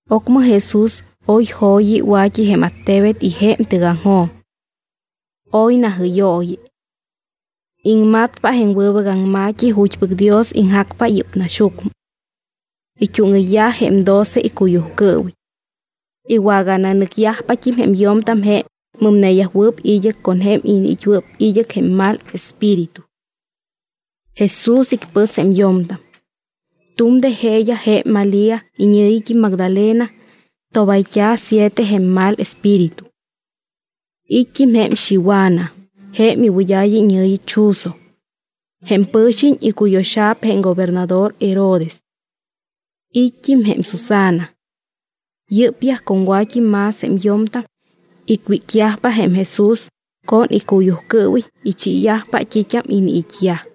Ocmɨ Jesús oy jo̱yi wa̱t́i jém attebet y jém tɨgaŋjoj. Oy najɨ́yooyi. Iŋmatpa jém wɨbɨc aŋma̱t́i ju̱t́pɨc Dios iŋjacpa yɨ́p naxyucmɨ. It́úŋɨyyaj jém doce icuyujcɨɨwiñ. Iwagananɨcyajpat́im jém yo̱mtam jém mɨmneyajwɨɨp id́ɨc con jém iniit́wɨɨp id́ɨc jém mal espíritu. Jesús icpɨs jém yo̱mtam. Tu̱m de jeeyaj jém Malía, iñɨ̱yit́im Magdalena, tobayt́a̱ siete jém mal espíritu. It́t́im jém Xiwana, jém iwɨd́a̱ya iñɨ̱yi Chuzo. Jém pɨ̱xiñ icuyo̱xa̱p jém gobernador Herodes. It́t́im jém Susana. Yɨ́pyaj con wa̱t́i más jém yo̱mtam icwícyajpa jém Jesús con icuyujcɨɨwiñ, ichiiyajpa t́it́am iniit́yaj.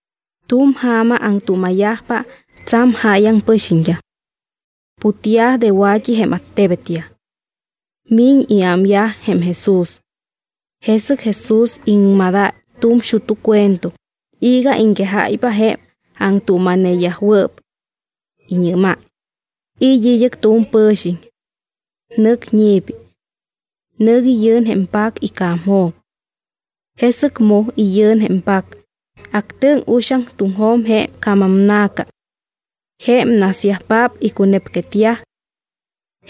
Tu̱m ja̱ma aŋtuuma̱yajpa tsa̱m jáyaŋ pɨxiñt́am. Putyaj de wa̱t́i jém attebetyaj. Miñ iámyaj jém Jesús. Jesɨc Jesús iŋmadáy tu̱m xut́u cuento iga iŋquejáypa jém aŋtuuma̱neyajwɨɨp. Iñɨ́máy: —It́ id́ɨc tu̱m pɨ̱xiñ. Nɨc ñi̱pi. Nɨc iyɨ̱n jém pac ica̱mjo̱m. Jesɨc mu iyɨ̱n jém pac, actɨŋ uxaŋ tuŋjo̱m jém ca̱maŋna̱ca. Jém nasyajpaap icunepnepquetyaj.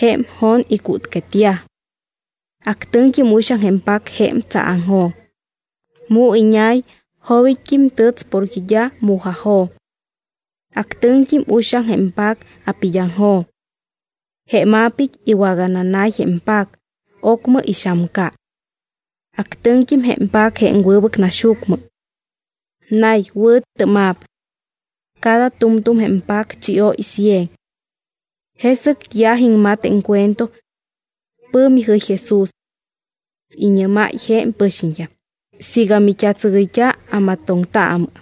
Jém jon icútquetyaj. Actɨŋt́im uxaŋ jém pac jém tsaaŋjo̱m. Mu iñay, jobit́t́im tɨts porque d́a mu̱jajo̱m. Actɨŋt́im uxaŋ jém pac apid́aŋjo̱m. Jém apit́ iwagananay jém pac, ocmɨ ixamca. Actɨŋt́im jém pac jém wɨbɨc naxyucmɨ. Nay, wɨ̱tɨ́ma̱p. Cada tu̱mtu̱m jém pac chióy cien. Jesɨc yaj iŋmat jém cuento. Pɨ̱mi jɨy Jesús. Iñɨ́máy jém pɨxiñt́am: —Siiga mit́atsɨgɨyt́a, amatoŋtaamɨ.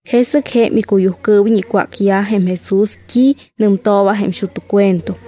Jesɨc jém icuyujcɨɨwiñ icwácyaj jém Jesús t́i nɨmtooba jém xut́u cuento.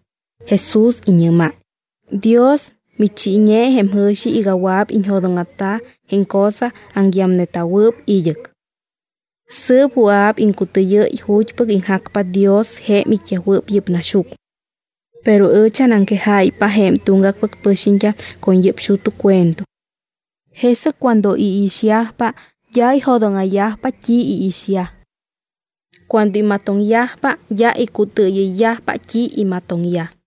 Jesús iñɨ́máy: —Dios michiiñe jém jɨ̱xi iga wɨa̱p iñjo̱dóŋa̱ta jém cosa aŋyamneta̱wɨɨp id́ɨc. Sɨɨp wɨa̱p iŋcutɨɨyɨ́y ju̱t́pɨc iŋjacpa Dios jém it́yajwɨɨp yɨ́p naxyucmɨ. Pero ɨch anaŋquejáypa jém tuŋgacpɨc pɨxiñt́am con yɨ́p xut́u cuento. Jesɨc cuando iixyajpa, d́a ijo̱dóŋa̱yajpa t́i iixyaj. Cuando imatoŋyajpa, d́a icutɨɨyɨyyajpa t́i imatoŋyaj.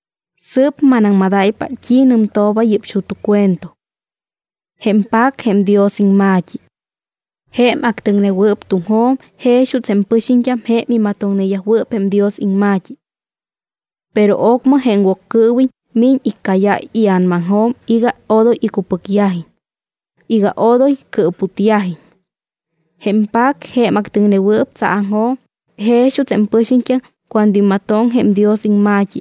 ’Sɨɨp manaŋmadáypa t́i nɨmtooba yɨ́p xut́u cuento. Jém pac jém Dios iŋma̱t́i. Jém actɨŋnewɨɨp tuŋjo̱m jex juuts jém pɨxiñt́am jém imatoŋneyajwɨɨp jém Dios iŋma̱t́i. Pero ocmɨ jém Woccɨɨwiñ miñ iccáyáy ia̱namaŋjo̱m iga odoy icupɨcyajiñ, iga odoy cɨɨputyajiñ. Jém pac, jém actɨŋnewɨɨp tsaaŋjo̱m, jex juuts jém pɨxiñt́am cuando imatoŋ jém Dios iŋma̱t́i,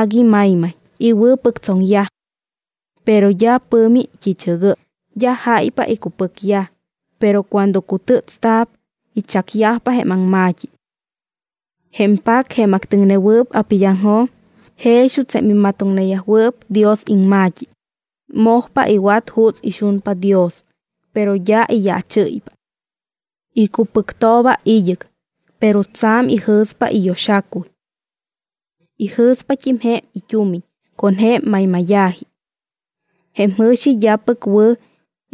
agui maymay, iwɨ̱pɨctsoŋyaj. Pero d́a pɨ̱mi t́i̱chɨgɨ́y, d́a jáypa icupɨcyaj, pero cuando cutɨ́tsta̱p, ichacyajpa jém aŋma̱t́i. Jém pac, jém actɨŋnewɨɨp apid́aŋjo̱m, jex juuts jém imatoŋneyajwɨɨp Dios iŋma̱t́i, mojpa iwat juuts ixunpa Dios, pero d́a iyaachɨ́ypa. Icupɨctooba id́ɨc, pero tsa̱m ijɨ̱spa iyo̱xacuy. Ijɨ̱spat́im jém it́umiñ con jém maymáya̱ji. Jém jɨ̱xi d́apɨc wɨ̱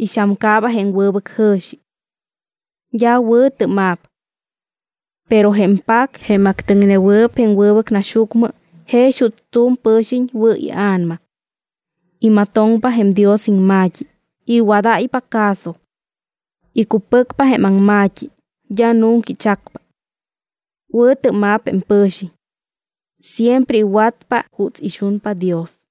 ixamcaaba jém wɨbɨc jɨ̱xi. D́a wɨ̱ tɨ́ma̱p. Pero jém pac, jém actɨŋnewɨɨp jém wɨbɨc naxyucmɨ, jex juuts tu̱m pɨ̱xiñ wɨ̱ ia̱nama, imatoŋpa jém Dios iŋma̱t́i, iwadáypa caso. Icupɨcpa jém aŋma̱t́i, d́a nunca ichacpa. Wɨ̱tɨ́ma̱p jém pɨ̱xiñ. Siempre iwatpa juuts ixunpa Dios.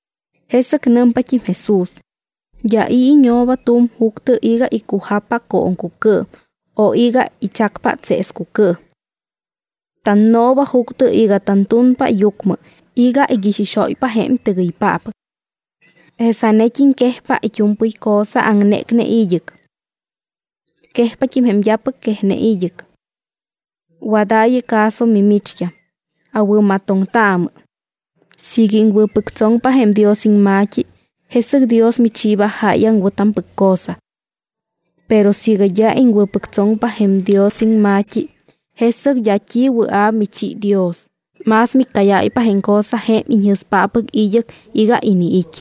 Jesɨc nɨmpat́im Jesús: —D́a i̱ iñooba tu̱m juctɨ iga icujappa cooŋcucɨɨm o iga ichacpa tseescucɨɨm. Tannooba juctɨ iga tantunpa yucmɨ iga iixixóypa jém tɨgɨypáppɨc. Jesanet́im quejpa it́u̱mpɨy cosa aŋnécne id́ɨc. Quejpat́im jém d́apɨc quejne id́ɨc. ’Wadaayɨ caso mimicht́am, awɨ̱matoŋtaamɨ. Siiga iŋwɨ̱pɨctsoŋpa jém Dios iŋma̱t́i, jesɨc Dios michiiba jáyaŋ wɨ̱tampɨc cosa. Pero siiga d́a iŋwɨ̱pɨctsoŋpa jém Dios iŋma̱t́i, jesɨc d́a t́i wɨa̱p michi Dios, más miccáyáypa jém cosa jém iñjɨ̱spáppɨc id́ɨc iga iniit́.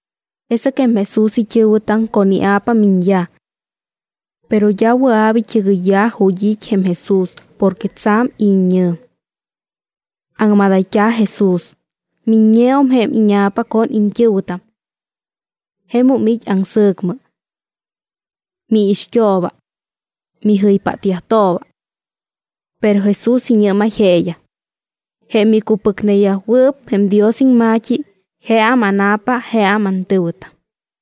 Jesɨc jém Jesús it́ɨ̱wɨtam con ia̱pa miñyaj. Pero d́a wɨa̱p it́ɨgɨyyaj ju̱t́ it́ jém Jesús porque tsa̱m it́ñɨ̱m. Aŋmadayt́a̱ Jesús: —Miññeum jém íña̱pa con iñt́ɨ̱wɨtam. Jemum it́ aŋsɨ̱cmɨ. Miixt́ooba. Mijɨypáttooba. Pero Jesús iñɨ́máy jeeyaj: —Jém icupɨcneyajwɨɨp jém Dios iŋma̱t́i, jeam ána̱pa, jeam antɨ̱wɨtam.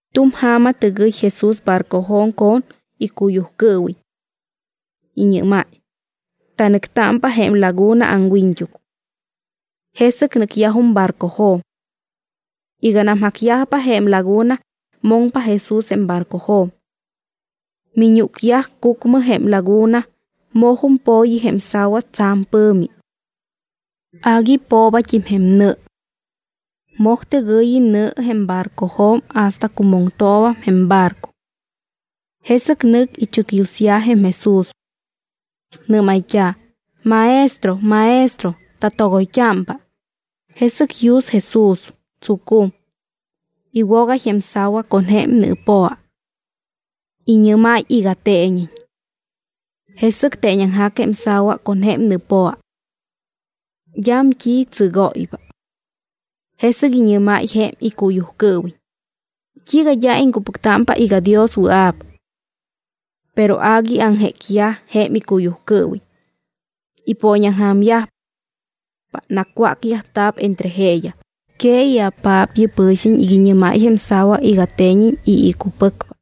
Tu̱m ja̱ma tɨgɨy Jesús barcojo̱m con icuyujcɨɨwiñ. Iñɨ́máy: —Tanɨctámpa jém laguna aŋwiñt́uc. Jesɨc nɨcyajum barcojo̱m. Iganam jacyajpa jém laguna, moŋpa Jesús jém barcojo̱m. Miñúcyaj cucmɨ jém laguna, mojum po̱yi jém sa̱wa tsa̱m pɨ̱mi. Agui poobat́im jém nɨ. Moj tɨgɨ̱yi nɨ jém barcojo̱m hasta cumoŋtoobam jém barco. Jesɨc nɨc ichɨcyusyaj jém Jesús. Nɨ́mayt́a̱: —¡Maestro! ¡Maestro! ¡Tatogoyt́ámpa! Jesɨc yus Jesús, tsucum. Iwogáy jém sa̱wa con jém nɨɨpoa. Iñɨ́máy iga teeñiñ. Jesɨc teeñaŋjac jém sa̱wa con jém nɨɨpoa. D́am t́i tsɨgóypa. Jesɨc iñɨ́máy jém icuyujcɨɨwiñ: —¿T́iiga d́a iŋcupɨctámpa iga Dios wɨa̱p? Pero agui aŋjécneyaj jém icuyujcɨɨwiñ. Ipooñaŋja̱myajpa. Nacwácyajta̱p entre jeeyaj: —Que i̱apaap yɨ́p pɨ̱xiñ iga iñɨ́máy jém sa̱wa iga teeñiñ y icupɨcpa.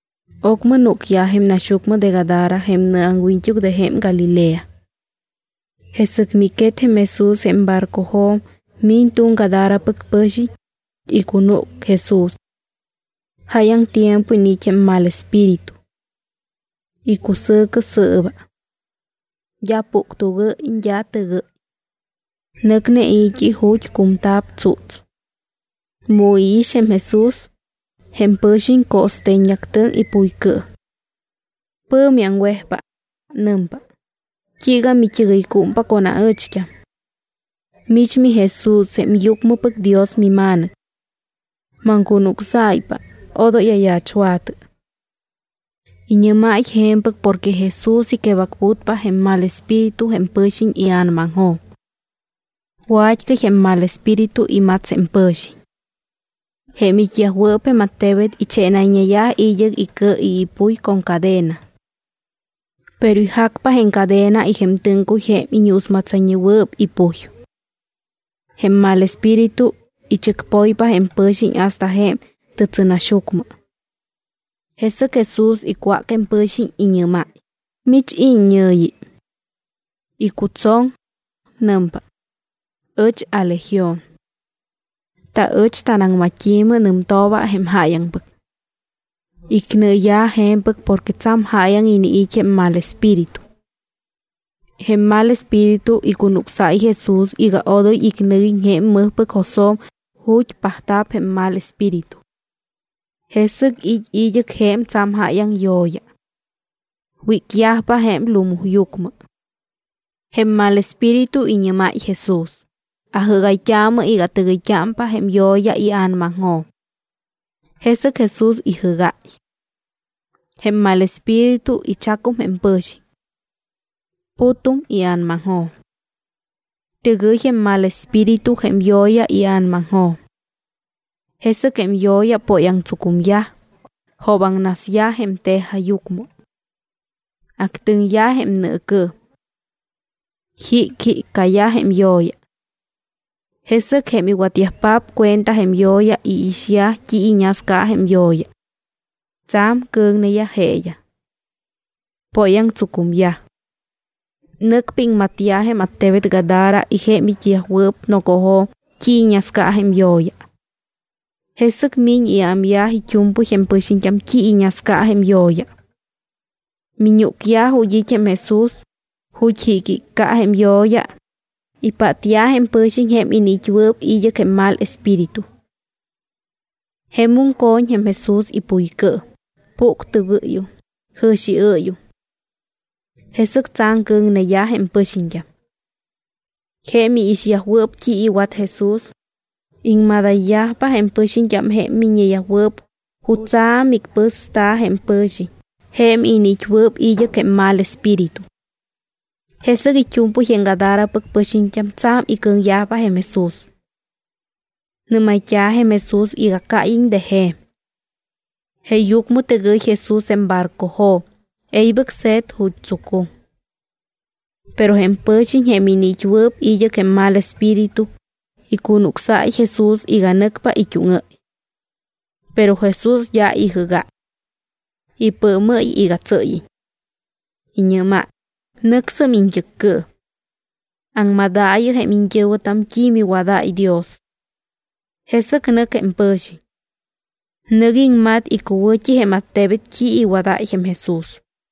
Ocmɨ núcyaj jém naxyucmɨ de Gadara jém nɨaŋwiñt́uc de jém Galilea. Jesɨc miquet jém Jesús jém barcojo̱m, miñ tu̱m Gadarapɨc pɨ̱xiñ, icunúc Jesús. Jáyaŋ tiempo iniit́ jém mal espíritu. Icusɨ̱cɨ sɨɨba. D́a puctugɨ́y, d́a tɨgɨ́y. Nɨcne i̱t́i ju̱t́ cumta̱p tsúts. Mu iix jém Jesús, jém pɨ̱xiñ co̱ste̱ññeactɨŋ ipuycɨɨm. Pɨ̱mi aŋwejpa. Nɨmpa: —¿T́iiga mit́ɨgɨycúmpa con aɨcht́am? Mich miJesús jém Yucmɨpɨc Dios miMa̱nɨc. Maŋcunucsáypa, odoy ayaachwa̱tɨ. Iñɨ́máy je̱mpɨc porque Jesús iquebacputpa jém mal espíritu jém pɨ̱xiñ ia̱namaŋjo̱m. Wa̱t́cɨy jém mal espíritu imats jém pɨ̱xiñ. Jém it́yajwɨɨp jém attebet ichénayñeyaj id́ɨc icɨ y ipuy con cadena. Pero ijacpa jém cadena y jém tɨ́ŋcuy jém iñuusmatsayñewɨɨp ipuy. Jém mal espíritu ichɨcpoypa jém pɨ̱xiñ hasta jém tɨtsɨnaxyucmɨ. Jesɨc Jesús icwác jém pɨ̱xiñ, iñɨ́máy: —¿Mich, i̱ iññɨ̱yi? Icutsoŋ. Nɨmpa: —Ɨch aLegión. Taɨch tanaŋmat́i̱mɨ nɨmtooba jém jáyaŋpɨc. Icnɨɨya̱ je̱mpɨc porque tsa̱m jáyaŋ iniit́ jém mal espíritu. Jém mal espíritu icunucsáy Jesús iga odoy icnɨguiñ jém mɨjpɨc josjo̱m ju̱t́ pajta̱p jém mal espíritu. Jesɨc it́ id́ɨc je̱m tsa̱m jáyaŋ yo̱ya. Wícyajpa jém lumuyucmɨ. Jém mal espíritu iñɨ́máy Jesús: —Ajɨ́gayt́aamɨ iga atɨgɨyt́ámpa jém yo̱ya ia̱namaŋjo̱m. Jesɨc Jesús ijɨ́gáy. Jém mal espíritu ichacum jém pɨ̱xiñ. Putum ia̱namaŋjo̱m. Tɨgɨy jém mal espíritu jém yo̱ya ia̱namaŋjo̱m. Jesɨc jém yo̱ya póyaŋtsucumyaj, joobaŋnasyaj jém tejajyucmɨ. Actɨŋyaj jém nɨɨcɨɨm. Jicjiccayaj jém yo̱ya. Jesɨc jém iwatyajpaap cuenta jém yo̱ya, iixyaj t́i iñasca jém yo̱ya. Tsa̱m cɨ̱ŋneyaj jeeyaj. Póyaŋtsucumyaj. Nɨcpa iŋmatyaj jém attebet Gadara y jém it́yajwɨɨp nocojo̱m t́i iñasca jém yo̱ya. Jesɨc miñ iámyaj it́u̱mpɨy jém pɨxiñt́am t́i iñasca jém yo̱ya. Miñúcyaj ju̱t́ it́ jém Jesús, ju̱t́ jicjicca jém yo̱ya, ipátyaj jém pɨ̱xiñ jém iniit́wɨɨp id́ɨc jém mal espíritu. Jemum co̱ñ jém Jesús ipuycɨɨm, puctugɨ́yum, jɨ̱xiɨ́yum. Jesɨc tsa̱m cɨ̱ŋneyaj jém pɨxiñt́am. Jém iixyajwɨɨp t́i iwat Jesús, iŋmadayyajpa jém pɨxiñt́am jém miññeyajwɨɨp jutsa̱ micpɨsta̱ jém iniit́wɨɨp id́ɨc jém mal espíritu. Jesɨc it́u̱mpɨy jém Gadarapɨc pɨxiñt́am tsa̱m icɨ̱ŋyajpa jém Jesús. Nɨ́mayt́a̱ jém Jesús iga cáyiñ de je̱m. Jeeyucmɨ tɨgɨy Jesús jém barcojo̱m, e̱ybɨc se̱t ju̱t́ tsucum. Pero jém pɨ̱xiñ jém iniit́wɨɨp id́ɨc jém mal espíritu icunucsáy Jesús iga nɨcpa it́úŋɨ́y. Pero Jesús d́a ijɨ́gáy. Ipɨɨmɨ́y iga tsɨ́yiñ. Iñɨ́máy: —Nɨcsɨm iñt́ɨccɨɨm. Aŋmadaayɨ jém iñt́ɨ̱wɨtam t́i miwadáy Dios. Jesɨc nɨc jém pɨ̱xiñ. Nɨc iŋmat icuwɨ̱t́i jém attebet t́i iwadáy jém Jesús.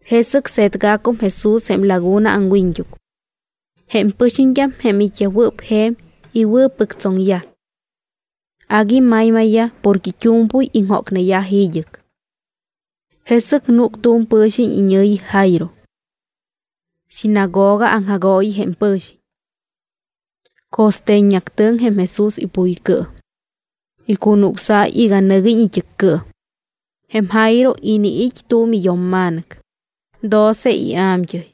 Jesɨc se̱tgacum Jesús jém laguna aŋwiñt́uc. Jém pɨxiñt́am, jém it́yajwɨɨp je̱m, iwɨ̱pɨctsoŋyaj. Agui maymayyaj porque it́u̱mpɨy iŋjócneyaj id́ɨc. Jesɨc núc tu̱m pɨ̱xiñ iñɨ̱yi Jairo. Sinagoga aŋjagooyi jém pɨ̱xiñ. Co̱ste̱ññeactɨŋ jém Jesús ipuycɨɨm. Icunucsáy iga nɨguiñ it́ɨccɨɨm. Jém Jairo iniit́ tu̱m iyo̱mma̱nɨc, doce ia̱mt́ɨy.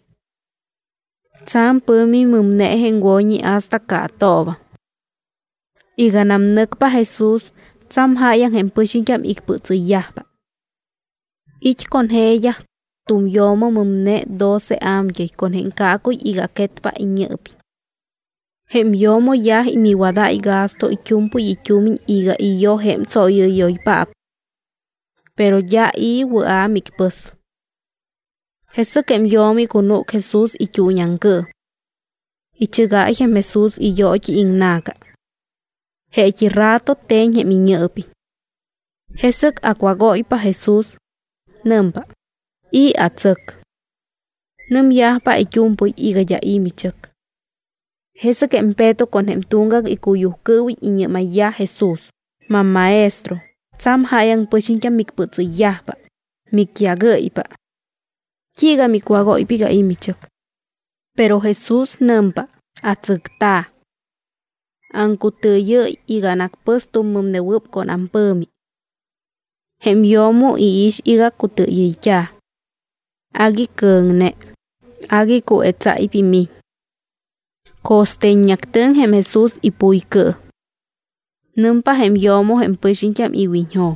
Tsa̱m pɨ̱mi mɨmne jém wo̱ñi hasta caatoobam. Iganam nɨcpa Jesús, tsa̱m jáyaŋ jém pɨxiñt́am icpɨtsɨyyajpa. It́ con jeeyaj tu̱m yo̱mo mɨmne doce a̱mt́ɨy con jém caacuy iga quetpa iñɨɨpiñ. Jém yo̱mo yaj miwadáy gasto it́u̱mpɨy it́umiñ iga iyoj jém tsóyɨ́yoypaap. Pero d́a i̱ wɨa̱ micpɨs. Jesɨc jém yo̱mo icunúc Jesús it́uuñiaŋcɨɨm. Ichɨgáy jém Jesús iyoot́i iŋna̱ca. Jeet́i rato te̱ñ jém iñɨɨpiñ. Jesɨc acwágóypa Jesús. Nɨmpa: —¿I̱ atsɨc? Nɨmyajpa it́u̱mpɨy iga d́a i̱ michɨc. Jesɨc jém Peto con jém tuŋgac icuyujcɨɨwiñ iñɨ́mayyaj Jesús: —MamMaestro, tsa̱m jáyaŋ pɨxiñt́am micpɨtsɨyyajpa, micyágɨ́ypa. ¿T́iiga micwágóypa iga i̱ michɨc? Pero Jesús nɨmpa: —Atsɨcta̱. Aŋcutɨɨyɨ́y iga anacpɨs tu̱m mɨmnewɨɨp con ampɨ̱mi. Jém yo̱mo iix iga cutɨɨyɨyt́a̱. Agui cɨ̱ŋne, agui cuetsáypa imiñ. Co̱ste̱ññeactɨŋ jém Jesús ipuycɨɨm. Nɨmpa jém yo̱mo jém pɨxiñt́am iwiñjo̱m: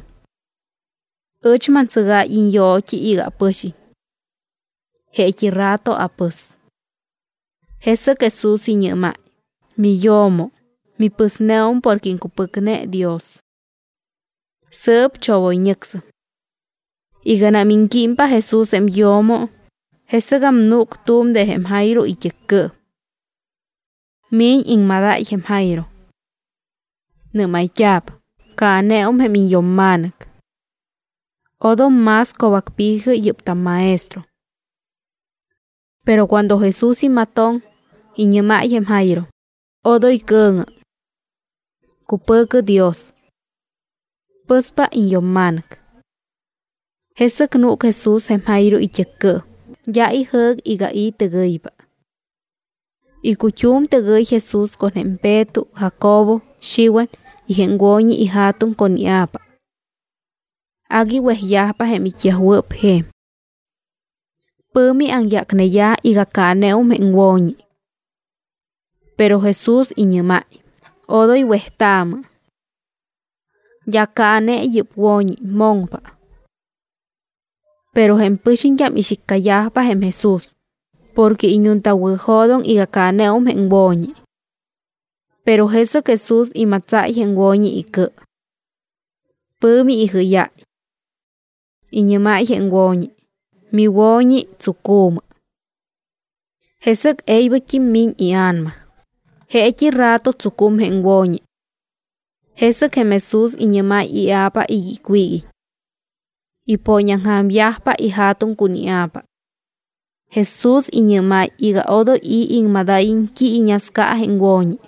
—Ɨch mantsɨgáy iñyoot́i iga apɨxiñ. Jeet́i rato apɨs. Jesɨc Jesús iñɨ́máy: —Miyo̱mo, mipɨsneum porque iŋcupɨcne Dios. Sɨɨp chogoyñɨcsɨm. Iganam iŋquímpa Jesús jém yo̱mo, jesɨgam núc tu̱m de jém Jairo it́ɨccɨɨm. Miñ iŋmadáy jém Jairo. Nɨ́mayt́a̱p: —Caaneum jém iñyo̱mma̱nɨc. Odom más co̱bacpi̱jɨ yɨ́p tamMaestro. Pero cuando Jesús imatoŋ, iñɨ́máy jém Jairo: —Odoy cɨ̱ŋɨ. Cupɨ̱cɨ Dios. Pɨspa iñyo̱mma̱nɨc. Jesɨc núc Jesús jém Jairo it́ɨccɨɨm, d́a ijɨ́c iga i̱ tɨgɨypa. Icut́um tɨgɨy Jesús con jém Peto, Jacobo, Xiwan y jém wo̱ñi ija̱tuŋ con ia̱pa. Agui wejyajpa jém it́yajwɨɨp je̱m. Pɨ̱mi aŋyácneyaj iga caaneum jém wo̱ñi. Pero Jesús iñɨ́máy: —Odoy wejtaamɨ. D́a caane yɨ́p wo̱ñi, moŋpa. Pero jém pɨxiñt́am ixiccayajpa jém Jesús porque iñuntawɨ̱jo̱doŋ iga caaneum jém wo̱ñi. Pero jesɨc Jesús imatsáy jém wo̱ñi icɨ. Pɨ̱mi ijɨ́yáy. Iñɨ́máy jém wo̱ñi: —Miwo̱ñi, tsucu̱mɨ. Jesɨc e̱ybɨct́im miñ ia̱nama, jeet́i rato tsucum jém wo̱ñi. Jesɨc jém Jesús iñɨ́máy ia̱pa iga icwíguiñ. Ipooñaŋja̱myajpa ija̱tuŋ con ia̱pa. Jesús iñɨ́máy iga odoy i̱ iŋmadáyiñ t́i iñasca jém wo̱ñi.